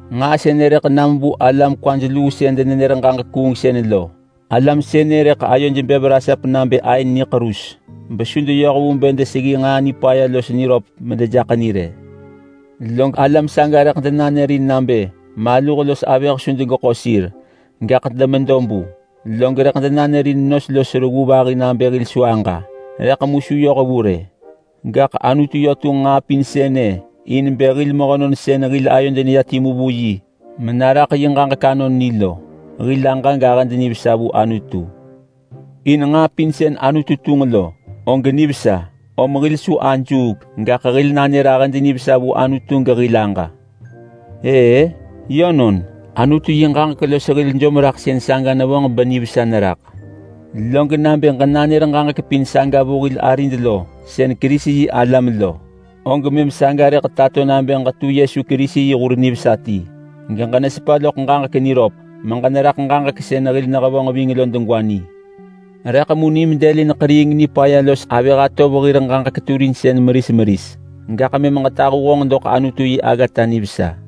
Nġaa sënë rëḳ nam vu alam kwaj luu sën denenër ġaġek kuungsën lo. Alam sënë rëḳ ayoj bev rasap nabë aën niḳerus, besu deyoh vu bë deseggi nġaa nipaya los niröp medejaḳ ni rë. Log alam saga rëḳ denanërin nabë maluh los avëh su degeḳo sir, gaḳ demedo bu, log rëḳ denanërin nos los reggu vahi nabë hil su aġa. Rëḳ mu su yoh vu rë, gaḳ Anutu yö tunġ nġaa pin sënë in bë hil mehönon sën hil ayod neya timu vu yi menaraḳ yi ġaġek anon ni lo, hil aġa gahëd nivesa vu Anutu. In nġaa pin sën Anutu tunġ lo og nivesa, om hil su ajuuk, gaḳ hil nanër ahëd nivesa vu Anutu gehil aġa. Ëë, yönon, Anutu yi ġaġek los hil jomraḳsën saga nevonġ benivesa neraḳ. Log nabë ġenanër ġaġek pin saga vu hil arid lo sën Kerisi-yi-alam lo, og mëm saga rëḳ tato nabë ġetu Yesu Kerisi yi hur nivesa ti geġenesepa loḳ ġaġek niröp meġeneraḳ ġaġek sën hil nehevonġ ving lo degwa ni. Rëḳ mu nim dëlin ḳeriing nipaya los avëh atov hir ġaġek turinsën meris meris, gaḳ mëm ġetahu honġ doḳ Anutu yi aggata nivesa.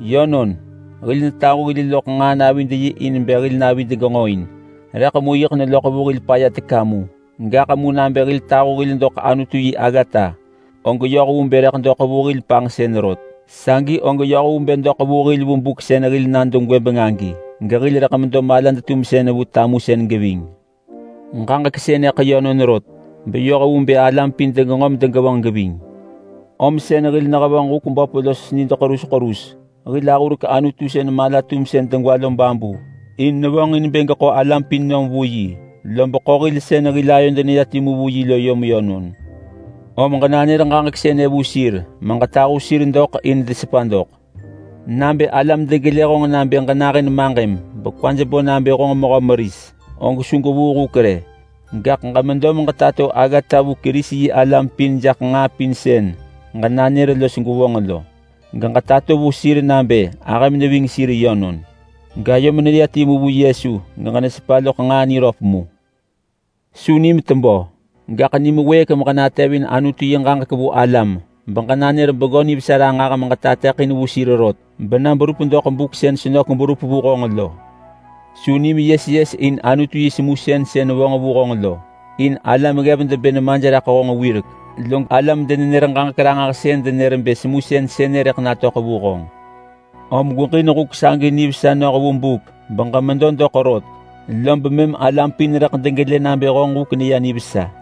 Yönon, hil netahu hil loḳ nġaa navid yi in bë hil navid genġoin, rëḳ mu yiḳ neloḳ vu hil paya teka mu. Gaḳ mu nabë hil tahu hil doḳ Anutu yi aggata, og yoh vu bë rëḳ doḳ vu hil panġsën rot. Sagi og yoh vu bë doḳ vu hil vu buk sën hil nado gwëbeng agi, gehil rëḳ medo malad-tumsën vu tamusën geving. Ġaġek sënëḳ yönon rot, beyoh vu bë alam pin degenġo medegevonġ geving. Om sën hil nehevonġ huk böp los nid ḳerus ḳerus. Hil ahurek Anutu sën mala-tumsën degwa lo babu in nevonġin bë geḳo alam pin nom vu yi, lob ḳo hil sën hil ayod neya timu vu yi lo yom yönon. Om ġenanër ġaġek sënë vu sir meġetahu sir doḳ in desepa doḳ. Nabë alam degelë honġ nabë ġenahën maġëm, bekwaj bo nabë honġ mehö meris, og su gwevuu huk rë. Gaḳ ġemedo meġetato aggata vu Kerisi-yi-alam pin jaḳ nġaa pin sën ġenanër los gwevonġ lo. Ġetato vu sir nabë ahëm neving sir yönon gayom neya timu vu Yesu, geġenesepa loḳ nġaa niröp mu. Su nim tebö, gaḳ nim wëëk meġenatevin Anutu yi ġaġek vu alam, beġenanër Bengö Nivesa ranġah meġetateḳin vu sir rot bena berup doḳ buk sën senök berup vu honġ lo. Su nim yes yes in Anutu yi semusën sën vo vu honġ lo, in alam ggev debë nemaj raḳ honġ wirek. Log alam-denenër-ġaġek-ranġahsën denër bë semusën sënë rëḳ natöḳ vu honġ. Om gweġin huk sagi nivesa noh vu buk beġemedo doḳ rot, lob mëm alam pin rëḳ degelë nabë honġ huk neya nivesa.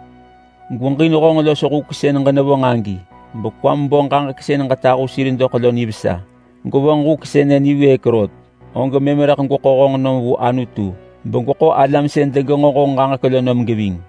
Gweġin honġ los huk sën ġenevonġ agi bekwam bo ġaġek sën ġetahu sir doḳ lo nivesa. Gwevonġ huk sënë niwëëk rot, og mëm rëḳ gweḳo honġ nom vu Anutu, begweḳo alam sën degenġo honġ ġaġek lo nom geving.